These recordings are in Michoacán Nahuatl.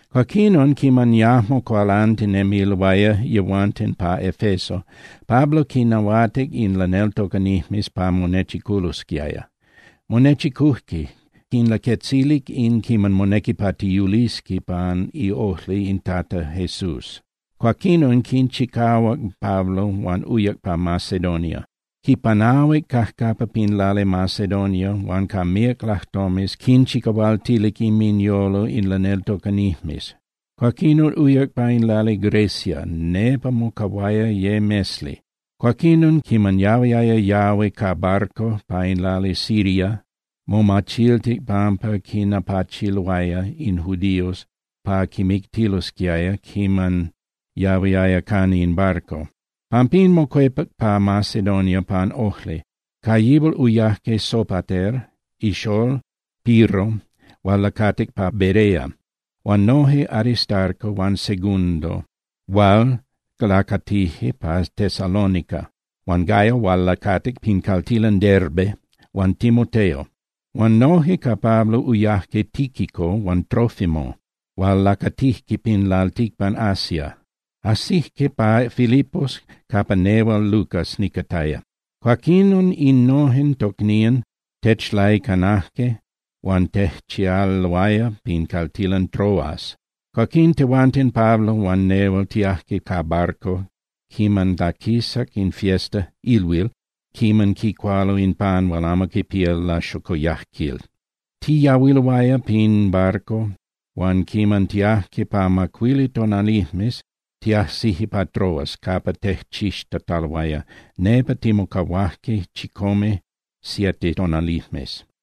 Cuaquinon, quiman yajmo cualantinemiloaya yehuanten pa Efeso, Pablo quinnahuatic in laneltocanijmes pa monechiculosquiaya. Monechicujque, quinlaquetzilic in quinami monequi pa tiyulisqui pan iojli in Tata Jesús. Cuaquinon quinchicahuac Pablo huan uyac pa Macedonia. Quipanahuic cajcapa pin lali Macedonia huan ca míac lajtomes quinchicahualtilic inminyolo in laneltocanijmes. Cuaquinon uyac pa in lali Grecia. Nepa mocahuaya ye mesli. Cuaquinon quiman yahuiaya yahui ca barco pa in lali Siria, momachiltic pampa quinapachiloaya in judíos pa quimictilosquiaya quiman yahuiaya cana in barco. Pampín mocuepac pa Macedonia pan ojli. Ca yihual uyajque Sopater ixolol Pirro hual lacatic pa Berea, huan noje Aristarco huan Segundo hual lacatijque pa Tesalónica huan Gayo hual lacatic pin caltilan Derbe, huan Timoteo. Huan noje ca Pablo uyajque Tíquico huan Trófimo hual lacatijque pin lalticpan Asia. Ajsijque pa Filipos capa nehual Lucas nicataya. Cuaquinon innojen tocnían techlaicanajque huan tejchialoaya pin caltilan Troas. Cuaquín tehuanten Pablo huan nehual tiajque ca barco quiman laquisac in fiesta (ilhuil) quiman quicualo in pan hual amo quipía laxocoyajquil. Tiyahuiloaya pin barco, huan quiman tiajque pa macuili tonalijmes, tiajsijque pa Troas capa tejchixtataloaya, nepa timocahuajque chicome (siete) tonalijmes.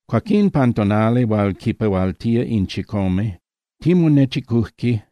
Cuaquín pan tonali hual quipehualtía in chicome, timonechicujque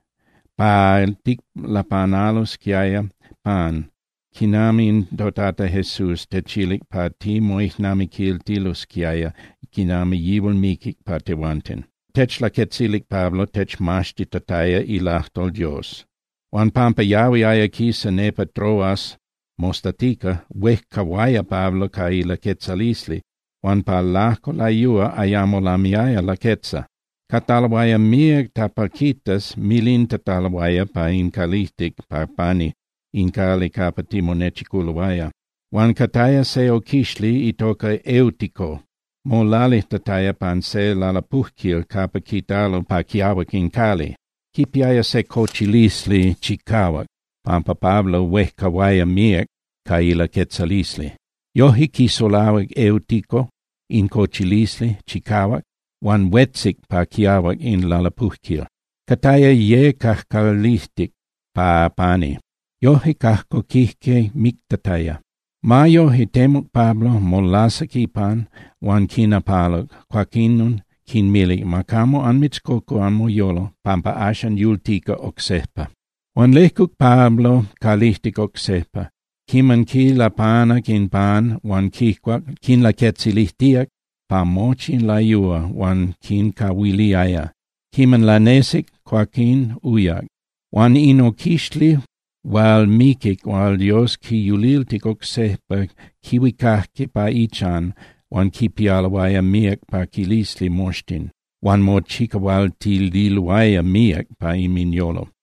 pa ticlapanalosquiaya pan quinami toTata Jesús techilic pa timoijnamiquiltilosquiaya quinami yihual miquic pa tehuanten. Techlaquetzilic Pablo techmaxtitataya ilajtol Dios. Huan pampa yahuiaya quisa nepa Troas mostatica, huejcahuaya Pablo ca ilaquetzalisli, huan pa lajco layúa ayamo lamiaya laquetza. Cataloaya míac tapalquitas milintataloaya pa in calijtic pa pani in cali capa timonechiculoaya. Huan cataya se oquixli itoca Eutico molalijtataya pa se lalapujquil capa quitalo pa quiahuac in cali. Quipiaya se cochilisli chicahuac pampa Pablo huejcahuaya míac ca ilaquetzalisli. Yojque quisulahuac Eutico in cochilisli chicahuac huan huetzic pa quiahuac in lalapujquil, cataya ye cajcalijtic pa pani. Yojque cajcoquijque mictataya. Ma yoje, temuc Pablo, molasac ipan huan quinapaluc, cuaquinon quinmilic: —Ma camo anmitzcocu anmoyolo, pampa axan yultica oc sejpa. Huan lejcuc Pablo calijtic oc sejpa. Quiman quilapanac in pan huan quicuac, quinlaquetzilijtíac pa mochi in layúa hual quincahuiliaya. Quiman lanesic, cuaquín uyac. Huan in oquixli hual miquic hual Dios quiyuliltic oc sejpa quihuicajque pa ichan huan quipialoaya míac paquilisli moxtin, huan mochicahualtililoaya míac pa inminyolo.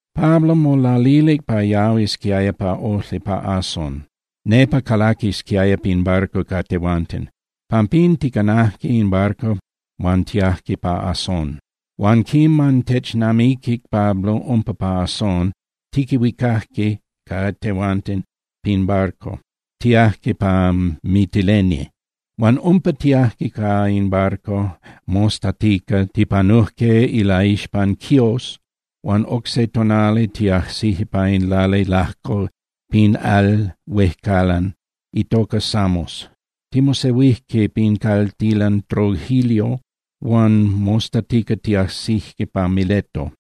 Pablo molalilic pa yahuisquiaya pa ojli pa Asón, nepa calaquisquiaya pin barco ca tehuanten. Pampín ticanajque in barco huan tiajque pa Asón. Huan quiman technamiquic Pablo umpa pa Asón, tiquihuicajque ca tehuanten pin barco, tiajque pa Mitilene. Huan umpa tiajque ca in barco, mostatica tipanujque ilaixpan Quiós huan oc se tonali tiajsijque pa in lali lajco pin al huejcalan itoca Samos. Timosehuijque pin caltilan Trogilio huan mostatica tiajsijque pa Mileto.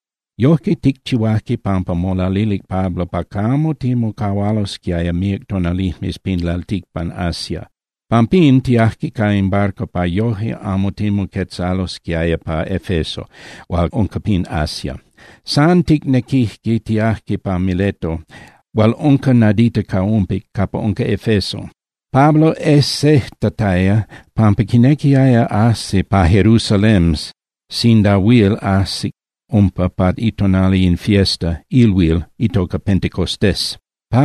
Yojque ticchihuajque pampa molalilic Pablo pa camo timocahualosquiaya míac tonalijmes pin lalticpan Asia, pampín tiajque ca in barco pa yoje amo timoquetzalosquiaya pa Efeso hual unca pin Asia. San ticnequijque tiajque pa Mileto hual unca nadita ca umpic capa unca Efeso. Pablo ejsejtataya pampa quinequiaya ajsi pa Jerusalén sinda huil ajsic umpa pa itonali in fiesta (ilhuil) itoca Pentecostés.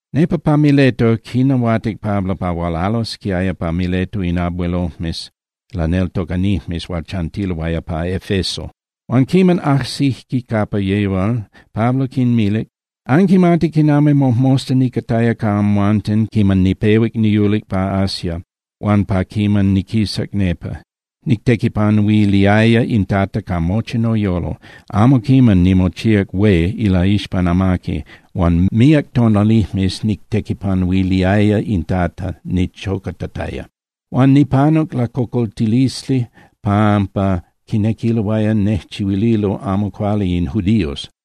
Nepa pa Mileto quinahuatic Pablo pa hualalosquiaya pa Mileto in abuelojmes laneltocanijmes hual chantiloaya pa Efeso. Huan quiman ajsijque capa yihual, Pablo quinmilic: —Anquimati quinami mojmosta nicataya ca amhuanten quiman nipehuac niyulic pa Asia huan pa quiman niquisac nepa. Nictequipanuiliaya in Tata ca mochi noyolo. Amo quiman nimochíac hué ilaixpan amaqui, huan míac tonalijmes nictequipanuiliaya in Tata nichocatataya. Huan nipanuc lacocoltilisli pampa quinequiloaya nejchihuililo amo cuali in judíos.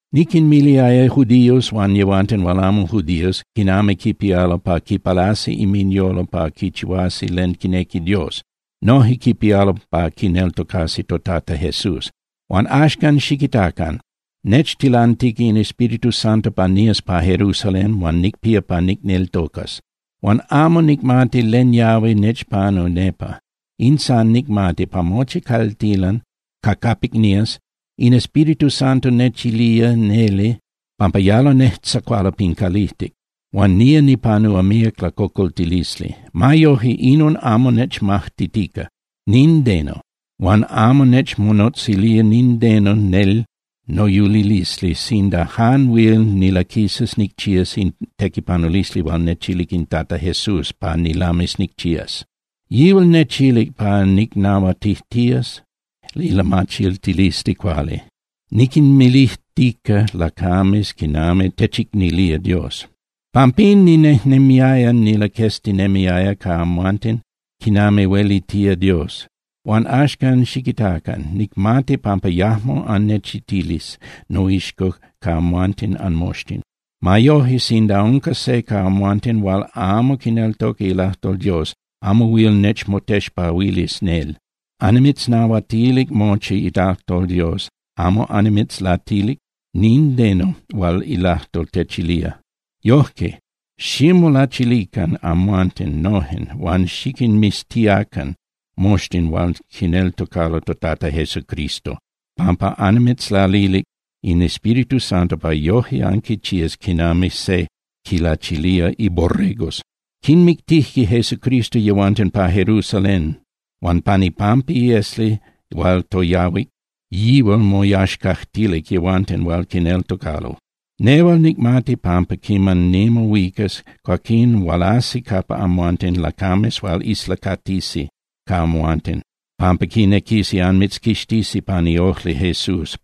Niquinmiliaya judíos huan yehuanten hual amo judíos quinami quipialo pa quipalasi inminyolo pa quichihuasi len quinequi Dios, noje quipialo pa quineltocasi toTata Jesús. ’Huan axcan, xiquitacan, nechtilantica in Espíritu Santo pa nías pa Jerusalén huan nicpía pa nicneltocas. Huan amo nicmati len yahui nechpanúa nepa. In san nicmati, pa mochi caltilan ca capic nías, in Espíritu Santo nechilía neli pampa yalo nejtzacualo pin calijtic huan nía nipanúa míac lacocoltilisli. Ma yoje, inon amo nechmajtitica nindeno huan amo nechmonotzilía nindeno nel noyulilisli sinda jan huil nilaquisas nicchías in tequipanulisli hual nechilic in Tata Jesús pa nilamis nicchías. Yihual nechilic pa nicnahuatijtías ilamachiltilisli cuali, niquinmilijtica lacames quinami techicnilía Dios. ’Pampín ninejnemiaya nilaqueztinemiaya ca amhuanten quinami huelitía Dios. Huan axcan xiquitacan. Nicmati pampa yajmo annechitilis noixco ca amhuanten anmoxtin. Ma yoje sinda unca se ca amhuanten hual amo quineltoca ilajtol Dios, amo huil nechmotexpahuilis nel. Annimitznahuatilic mochi ilajtol Dios, amo annimitzlatilic nindeno hual ilajtol techilía. Yojque, ximolachilican amhuanten nojen huan xiquinmiztiacan moxtin hual quineltocalo toTata Jesucristo, pampa anmitzlalilic in Espíritu Santo pa yoje anquichías quinami se quilachilía iborregos. Quimictijque Jesucristo yehuanten pa Jerusalén huan pan ipampa iesli hual toyahuic, yihual moyaxcajtilic yehuanten hual quineltocalo. Nehual nicmati pampa quiman nimohuicas, cuaquín hualasi capa amhuanten lacames hual islacatisi ca amhuanten pampa quinequisi anmitzquixtisi pan iojli Jesús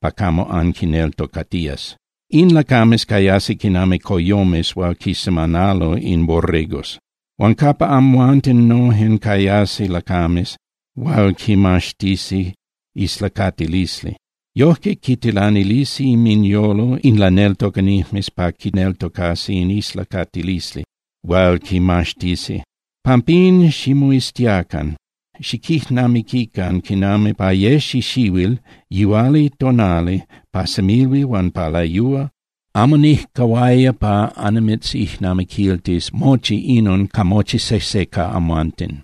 pa camo anquitocatías. In lacames cayasi quinami coyomes hual quisemanalo in borregos. Huan capa amhuanten nojen cayasi lacames hual quimaxtisi islacatilisli. Yojque quitilanilisi inminyolo in laneltocanijmes pa quineltocasi in islacatilisli hual quimaxtisi. Pampín ximoiztiacan, xiquijnamiquican quinami pa ye xixihuil yihualitonali, pa semilhuil huan pa layúa, amo nijcahuaya pa annimitzijnamiquiltis mochi inon ca mochi sejse ca amhuanten,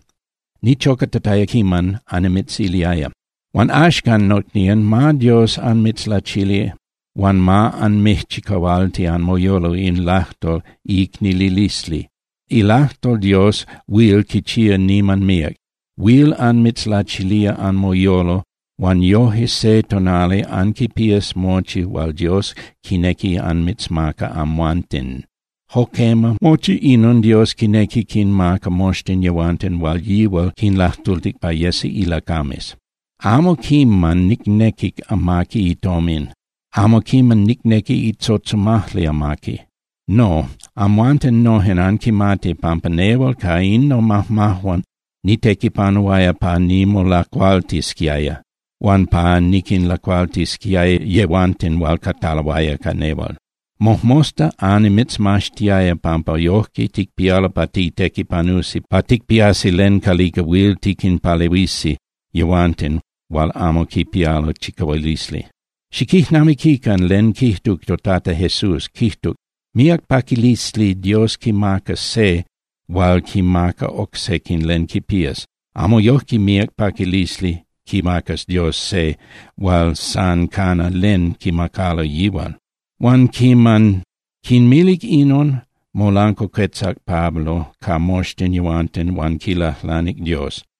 nichocatataya quiman annimitziliaya. ’Huan axcan nocnían, ma Dios anmitzlachili huan ma anmijchicahualti anmoyolo in ilajtol iicnililisli. Ilajtol Dios huil quichía niman míac. Huil anmitzlachilía anmoyolo huan yoje se tonali anquipías mochi hual Dios quinequi anmitzmaca amhuanten. Jo quema, mochi inon Dios quinequi quinmaca moxtin yehuanten hual yihual quinlajtultic pa yesi ilacames. Amo quiman nicnequic amaqui itomin, amo quiman nicnequic itzotzomajli amaqui. No, amhuanten nojen anquimati pampa nehual ca in nomajmajuan nitequipanuaya pa nimolacualtisquiaya huan pa niquinlacualtisquiaya yehuanten hual cataloaya ca nehual. Mojmosta annimitzmaxtiaya pampa yojque ticpialo pa titequipanusi pa ticpiasi len calica huil tiquinpalehuisi yehuanten hual amo quipialo chicahualisli. Xiquijnamiquican len quijtuc toTata Jesús, quijtuc: “Míac paquilisli Dios quimacas se hual quinmaca oc sequin len quipías. Amo yojque míac paquilisli quimacas Dios se hual san cana len quimacalo yihual.” Huan quiman quinmilic inon, molancuacuetzac Pablo ca moxtin yehuanten huan quilajlanic Dios.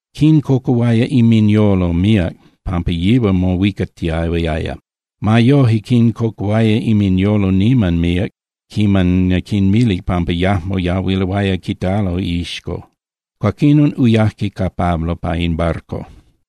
Quincocuhuaya inminyolo míac pampa yihual mohuicatiahuiaya. Ma yoje quincocuhuaya inminyolo niman míac quiman quinmilic pampa yajmo yahuiloaya quitalo iixco. Cuaquinon uyajque ca Pablo pa in barco.